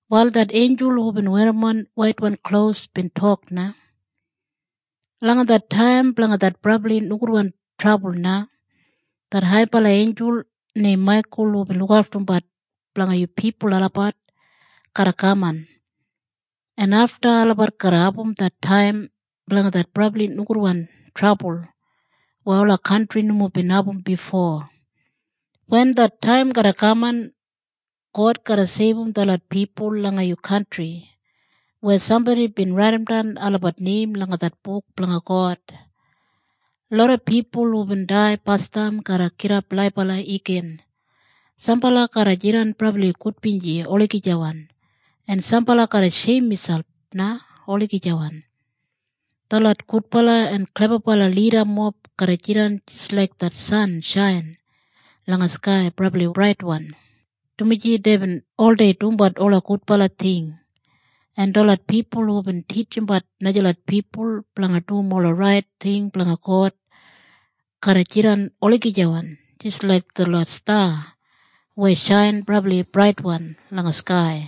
Wal det einjul hubin werrimon waitwan klos bin tok na, “Langa det taim blanga det brabli nogudwan trabul na, det haibala einjul neim Maikul hubin lukaftumbat blanga yu pipul olabat garra kaman. En afta na olabat garra abum det taim blanga det brabli nogudwan trabul weya ola kantri nomo bin abum bifo. Wen det taim garra kaman God garra seibum detlot pipul langa yu kantri weya sambodi bin raidimdan olabat neim langa det buk blanga God. Loda pipul hubin dai basdam garra gidap laibala igin. Sambala garra jidan brabli gudbinji olagijawan, en sambala garra sheim miselp na olagijawan. Detlot gudbala en sabibala lidamob garra jidan jis laik det san shain langa skai brabli braitwan, dumaji deibin oldei dumbat ola gudbala ting. En detlot pipul hubin titjimbat najalot pipul blanga dum ola rait ting blanga God garra jidan olagijawan jis laik detlot sta weya shain brabli braitwan langa skai.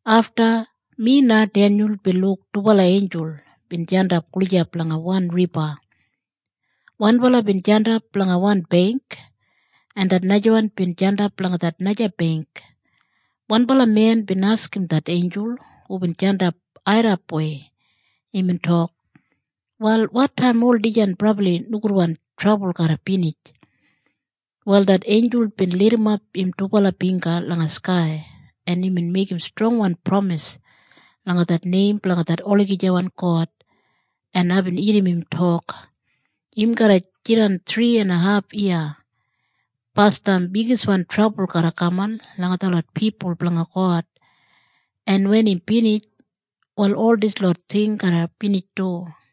Afta, mi na Denyul bin luk dubala einjul bin jandap gulijap langa wan riba. Wanbala bin jandap langa wan beingk en det najawan bin jandap langa det naja beingk. Wanbala men bin askim det einjul hubin jandap airrapwei. Imbin tok, “Wal wotaim ol dijan brabli nogudwan trabul garra binij?” Wal det einjul bin lidimap im dubala bingga langa skai en imbin meigim strongwan pramis langa det neim blanga det olagijawan God, en aibin irrim im tok, “Im garra jidan thri en haf yiya. Basdam bigiswan trabul garra kaman langa detlot pipul blanga God en wen im binij wal ol dislot ting garra binij du.”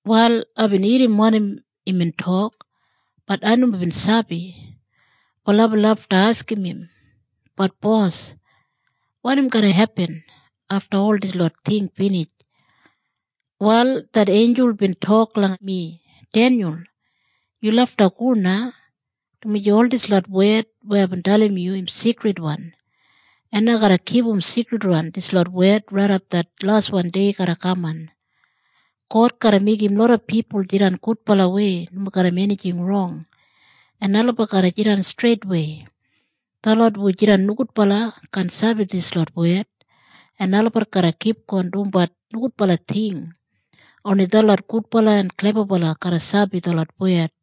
Wal aibin irrim wanim imbin tok, bat ai nomo bin sabi. Wal aibin lafta askim im, “Bat bos, wanim garra hepin afta ol dislot ting binij?” Wal det einjul bin tok langa mi, “Denyul, yu lafta go na, dumaji ol dislot wed aibin dalim yu im sigridwan, en ai garra kipum sigridwan dislot wed raidap det laswan dei garra kaman. God garra meigim loda pipul jidan gudbalawei nomo garram enijing rong en olabat garra jidan streitwei. Detlot hu jidan nogudbala kaan sabi dislot wed, en olabat garra kipgon dumbat nogudbala ting. Oni detlot gudbala en klebabala garra sabi detlot wed.